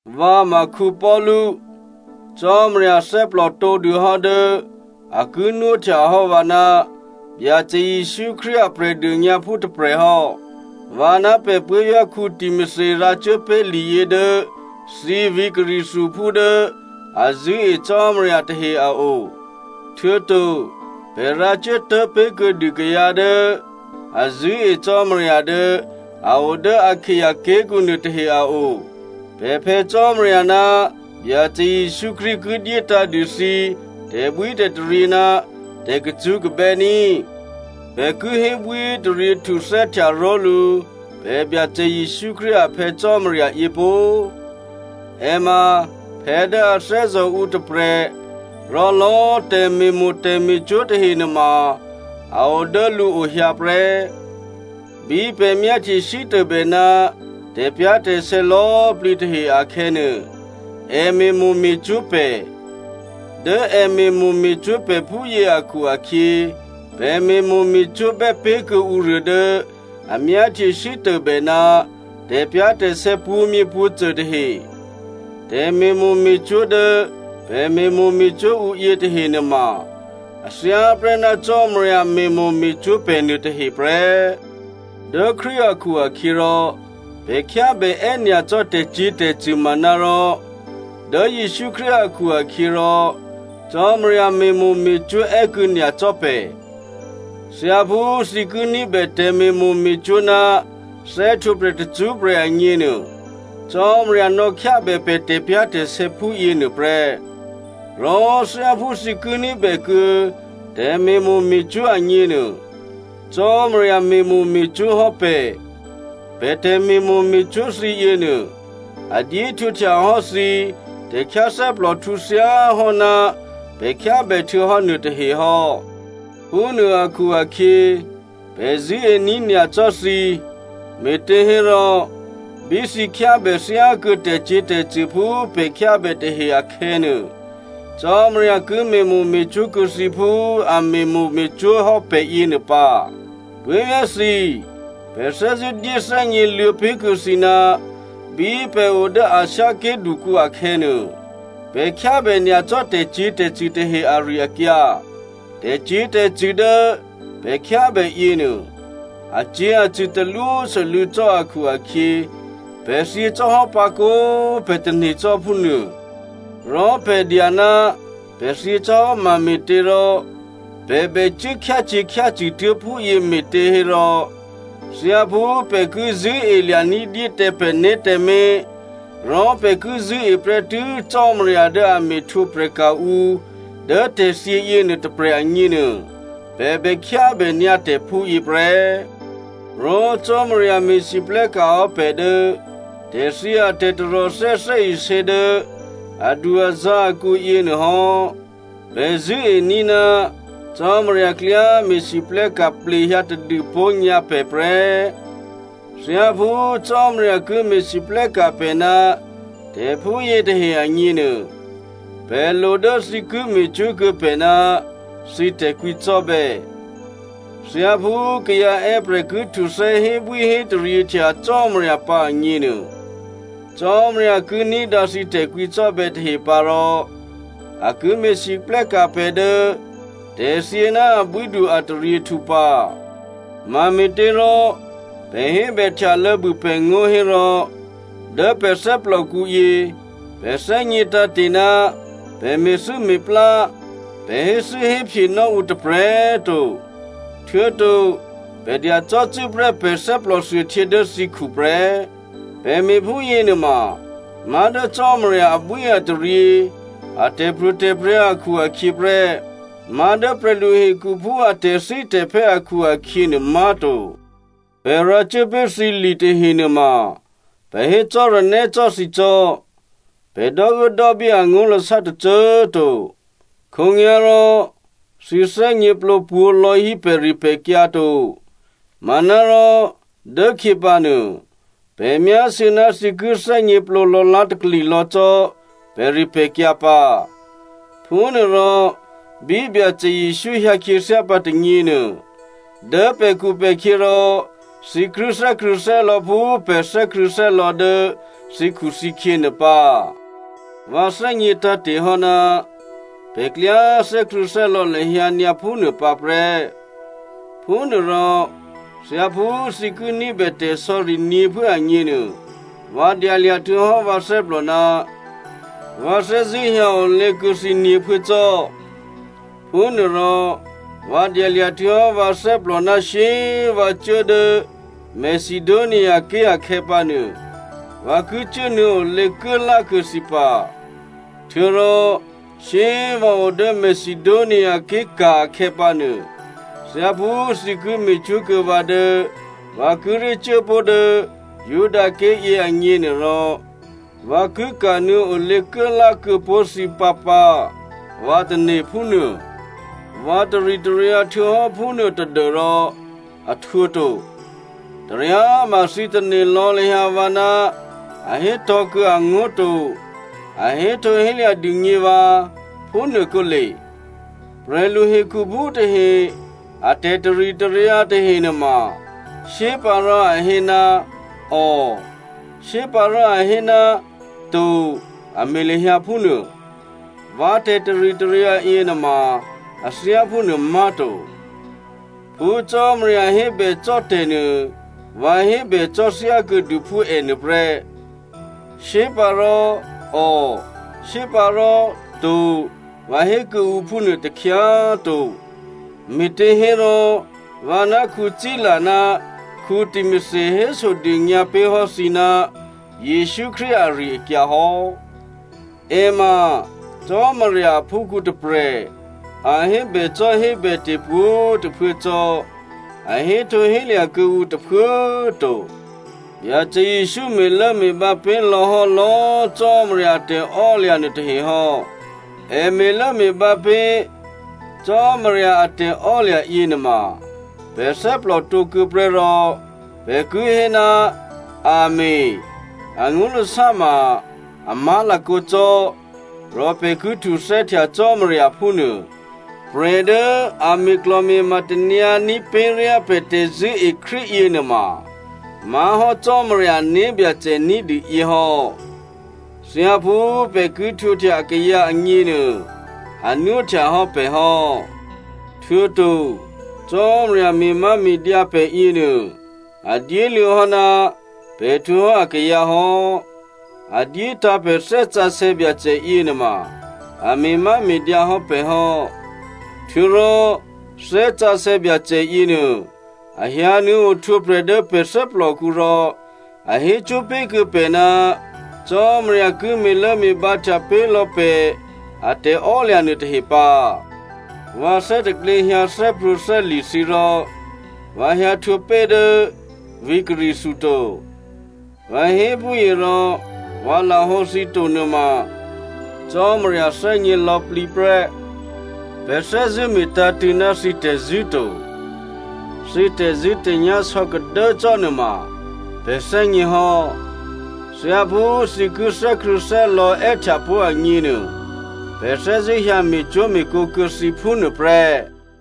Vǎ ma Paulu. Cò́marya thè́plò tǒdûhò́ dố a ki nwóhtyahò́ vǎ ná Byacè Jesǔ Krístu a Prè̤dônyǎphú tôprè̤ hò́. Vǎ ná pè̤ puố̤vyá̤ Timothy rǎcuốpé̤ liyě dố thǐ vǐ̤ Corinthiaphú dố a zṳ̂́e Cò́marya tahe a o. Htuô̌to pè̤ rǎcuốtố̤ pé̤kuô̌dû kayǎ dố a zṳ̂́e Cò́marya dố a o dố Akaia ké̤kǔ nuôtahe a o. Pè̤ Phè̌ Cò́marya ná Byacè Jesǔ Krístu ki dyétǎ̤dû thǐ tè̤bwítè̤taryě ná tè̤kacṳ́kabè́ ní꤮. Pè̤ ki hébwíhétaryě htuthè́htya ró̤lǔ pè̤ Byacè Jesǔ Krístu a Phè̌ Cò́marya yě pó꤮. È ma phè̌ dố a thè́zò̤ ǔ tôprè̤, rò lò̌꤮ tè̤me̤mo̤ tè̤me̤cwó̤ tahe nuôma a o dố lǔo hyǎ prè́. Bí pè̤ myáhtye sítôbè ná tè̤pyá̤tè̤sè̌ lò̌꤮ plǐ tahe akhè̌nuô, è me̤mo̤ me̤cwó̤ pè̤. Dố è me̤mo̤ me̤cwó̤ pè̤ phúyě akhu-akhyě, pè̤ me̤mo̤ me̤cwó̤bè́ pé̤ kuô̌ ǔruô dố a myáhtye sítôbè ná tè̤pyá̤tè̤sè̌ pwǒ̤myěpwǒ̤cô tahe. Tè̤me̤mo̤ me̤cwó̤ dố pè̤ me̤mo̤ me̤cwó̤ ǔ yětahe nuôma, a thyáprè́ ná Cò́marya me̤mo̤ me̤cwó̤ pè̤ nuôtahe prè́. Dố Krístu akhu-akhyěrò pè̤ khyábè è́nyacò́ tè̤cyě̤tè̤cṳ̂, manárò dố Jesǔ Krístu akhu-akhyěrò Cò́marya me̤mo̤ me̤cwó̤ è́kuô̌ nyacò́ pè̤. Thyáphú thǐ ki ní̤bè tè̤me̤mo̤ me̤cwó̤ ná thè́htwǒprè̤ tacṳ́prè̤ agněnuô, Cò́marya nò̌khyábè pè̤ tè̤pyá̤tè̤sè̌ phúyěnuô prè́. Rò thyáphú thǐ ki ní̤bèkuô̌ tè̤me̤mo̤ me̤cwó̤ agněnuô, Cò́marya me̤mo̤ me̤cwó̤ hò́ pè̤. Pè̤ tè̤me̤mo̤ me̤cwó̤ thǐ yěnuô, a dyéhtwǒhtya hò́ thǐ tè̤khyáthè́plòhtǔ thyáhò́ná pè̤ khyábè htuô̌hò́ nuôtahe hò́. Phúnuô akhu-akhyě, pè̤ zṳ̂́ení̤ nyacò́ thǐ, me̤těhérò bí thǐ khyábè thyákuô̌ tè̤cyě̤tè̤cṳ̂ phú pè̤ khyábè tahe akhè̌nuô, Cò́marya ki me̤mo̤ me̤cwó̤ kuô̌ thǐ phú a me̤mo̤ me̤cwó̤ hò́ pè̤ yěnuô pǎ. Puố̤vyá̤ thǐ꤮, pè̤ thè́zṳ̂́ dyé thè́gněluô̌ pé̤kuô̌ thǐ ná bí pè̤ o dố Asia ké̤ dukǔ akhè̌nuô, pè̤ khyábè nyacò́ tè̤cyě̤tè̤cṳ̂ tahe ari-akyǎ. Tè̤cyě̤tè̤cṳ̂ dố pè̤ khyábè yěnuô, acyě̤acṳ̂ talwósû́lû̌ cò́ akhu-akhyě pè̤ thyěcò́hò́ pǎkǒ꤮ pè̤ tane̤ cò́ phúnuô. Rò pè̤ dya ná pè̤ thyě cò́ hò́ mame̤těrò pè̤ bècuố khyácyě̤khyácṳ̂ tuố̤ phúyě me̤těhérò, thyáphú pè̤ ki zṳ̂́elya̤ ní̤dyé tǎ pè̤né̤ tǎmé̤, rò pè̤ ki zṳ̂́e prè́tû́ Cò́marya dố a me̤ htwǒprè̤ka̤ ǔ dố tè̤thyě yěnuô tôprè̤ agněnuô, pè̤ bè khyábènyǎ tè̤ phúyě prè́. Rò Cò́marya me̤lwóhteka̤ hò́ pè̤ dố tè̤thyě a tè̤taròthè́ thè́isě dố adu-azǎ̤ akǔ yěnuô hò́. Pè̤ zṳ̂́ení̤ ná Cò́marya klyá me̤lwóhteka̤ plehyǎ tadûpó̤ nyǎ pè̤ prè́. Thyáphú Cò́marya ki me̤lwóhteka̤ pè̤ ná tè̤phúyě tahe agněnuô, pè̤ lo dố thǐ ki me̤cwó̤kuô̌ pè̤ ná thǐ tè̤kwǐcò́bè̌. Thyáphú kayǎ è́prè̤ ki htuthè́ hébwíhétaryěhtya Cò́marya pǎ agněnuô, Cò́marya ki ní̤dǎ thǐ tè̤kwǐcò́bè̌ tahe pǎ rò a ki me̤lwóhteka̤ pè̤ dố tè̤thyě ná abwídu ataryěhtǔ pǎ. Mame̤těrò pè̤ hébèhtyalô̌ bû pè̤ngó̤ hérò, dố pè̤ thè́plòkǔyě pè̤ thè́gně tǎ̤te̤ ná pè̤ me̤thû́me̤plá, pè̤ héthû́héphyenò́ ǔ tôprè̤꤮ to, htuô̌to pè̤ dya cò́cû́prè́ pè̤ thè́plòthuôhtyě dố thǐkhu prè́. Pè̤ me̤phúyě nuôma má̤ dố Cò́marya abwíataryě a tè̤pro̤tè̤prya̤ akhu-akhyě prè́, má̤dố prè̤lu hekhuphú a tè̤thítè̤phè́ akhu-akhyě nuô má̤to. Pè̤ rǎcuố pé̤ thǐ li tahenuôma, pè̤ hé cò́ranè́ cò́ thǐ cò́, pè̤ dò́uốdò́bí angó̤lasá tôcô꤮ to. Khǒnyá̤rò thǐ thè́gněplǒ pwǒ̤ lò̌ hí pè̤ripè̤kyǎ to, manárò dốkhyěpǎnuô pè̤ myásû̌ ná thǐ ki thè́gněplǒ lò̌lá̤takli lò̌ cò́ pè̤ripè̤kyǎ pǎ. Phúnuôrò, bí Byacè Jesǔ hyǎkhyěthyá pǎ tônyěnuô, dố pè̤khupè̤khyě rò thǐ ki thè́krṳ̂̌thè́lò̌ phú pè̤ thè́krṳ̂̌thè́lò̌ dố thǐkhuthǐkhyě nuô pǎ. Vǎ thè́gnětǎ̤te̤ hò́ ná pè̤ klyá thè́krṳ̂̌thè́lò̌ lahyǎ nyǎ phúnuô pǎ prè́. Phúnuôrò thyáphú thǐ ki ní̤bè tè̤sò̌ri nyě̤phuố agněnuô, vǎ dyalya̤ htuô̌hò́ vǎ thè́plò ná vǎ thè́zṳ̂́ hyǎ olě kuô̌ thǐ nyě̤phuố cò́. Phúnuôrò vǎ dyalya̤ htuô̌hò́ vǎ thè́plò ná shyé꤮ vǎ cuố dố Macedoniaké̤ akhè̌pǎnuô vǎ ki cuốnuô̌olě kuốlá kuô̌ thǐ pǎ. Htuô̌rò shyé꤮ vǎ o dố Macedoniaké̤ ka̤ akhè̌pǎnuô, thyáphú thǐ ki me̤cwó̤kuô̌ vǎ dố vǎ kíré̤ cuốpó̤ dố Judaké̤ yěagněnuôrò, vǎ ki kanuô̌ olěkuốlá kuô̌ pó̤ thǐ pǎpǎ, vǎ tane̤ phúnuô. Vǎ taritaryǎ htuô̌hò́ phúnuô tadû́rò a htwǒto. Taryáma thǐ tane̤ lò̌ lahyǎ vǎ ná a hétò̤̌ kuô̌ angó̤ to, a héhtǒhélya̤ dûgně vǎ, phúnuô kǒle. Prè̤lu hekhuphú tahe a tè̤taritaryǎ tahenuôma, shyépǎ rò a hé, “ò,” shyépǎ rò a hé, “to,” a me̤ lahyǎ phúnuô. Vǎ tè̤taritaryǎ yěnuôma a thyá phúnuô má̤to. Phú Cò́marya hébècò́ tè̤ nuô, vǎ hébècò́ thyákuô̌dû phú è nuôprè́. Shyépǎ rò “ò,” shyépǎ rò “to,” vǎ hé kuô̌ǔ phúnuô takhyá꤮ to. Me̤těhérò vǎ ná Sila ná Timothy hésodônyǎ pé̤hò́ thǐ ná Jesǔ Krístu ari-akyǎ hò́. È ma Cò́marya aphúkhǔ tôprè̤, a hébècò́hébète̤ pwǒ̤꤮ tôphuố cò́, a héhtǒhélya̤ kuô̌ǔ tôphuố꤮ to. Byacè Jesǔ me̤lốme̤bǎ pé̤ lò̌ hò́ lò̌꤮ Cò́marya a tè̤ò́lya̤ nuôtahe hò́. È me̤lốme̤bǎ pé̤ Cò́marya a tè̤ò́lya̤ yěnuôma, pè̤ thè́plòtǒ kuô̌ prè́ rò pè̤ ki hé, “Amèn” angó̤lasá ma “A má̤lakǒ cò́” rò pè̤ ki htuthè́htya Cò́marya phúnuô. Prè̤ dố a me̤klò̤me̤ma tanyǎní̤ pé̤ ryá pè̤ tè̤zṳ̂́ení̤ Krístu yěnuôma má̤hò́ Cò́marya ané̤byacè ní̤dû yě hò́. Thyáphú pè̤ ki htwǒhtya akayǎ agněnuô, a nwóhtya hò́ pè̤ hò́. Htuô̌to, Cò́marya me̤máme̤dyǎ pè̤ yěnuô, a dyéluô̌ hò́ ná pè̤ htwǒ hò́ akayǎ hò́. A dyétǎ̤ pè̤ Thè́ Sǎsè̌ Byacè yěnuôma a me̤máme̤dyǎ hò́ pè̤ hò́. Htuô̌rò Thè́ Sǎsè̌ Byacè yěnuô, a hyǎnuô̌ ohtwǒprè̤ dố pè̤ thè́plòkǔ rò a hécwó̤ pé̤kuô̌ pè̤ ná Cò́marya ki me̤lốme̤bǎhtya pé̤ lò̌ pè̤ a tè̤ò́lya̤ nuôtahe pǎ. Vǎ thè́taklě hyǎ thè́prwǒ̤thè́li̤ thǐ rò vǎ hyǎhtwǒ pé̤ dố vǐ̤ Corinthia to. Vǎ hé phúyě rò vǎ lahǒ thǐ to nuôma Cò́marya thè́gně lò̌plǐ prè́. Pè̤ thè́zṳ̂́ me̤tǎ̤tṳ̂̌ ná thǐ tè̤zṳ̂́ to. Thǐ tè̤zṳ̂́tè̤nyá̤ sò̌kadố cò́ nuôma pè̤ thè́gně hò́. Thyáphú thǐ ki thè́krṳ̂̌thè́lò̌ è́htyapó̤ agněnuô, pè̤ thè́zṳ̂́ hyǎ me̤cwó̤me̤kǒ kuô̌ thǐ phúnuô prè́.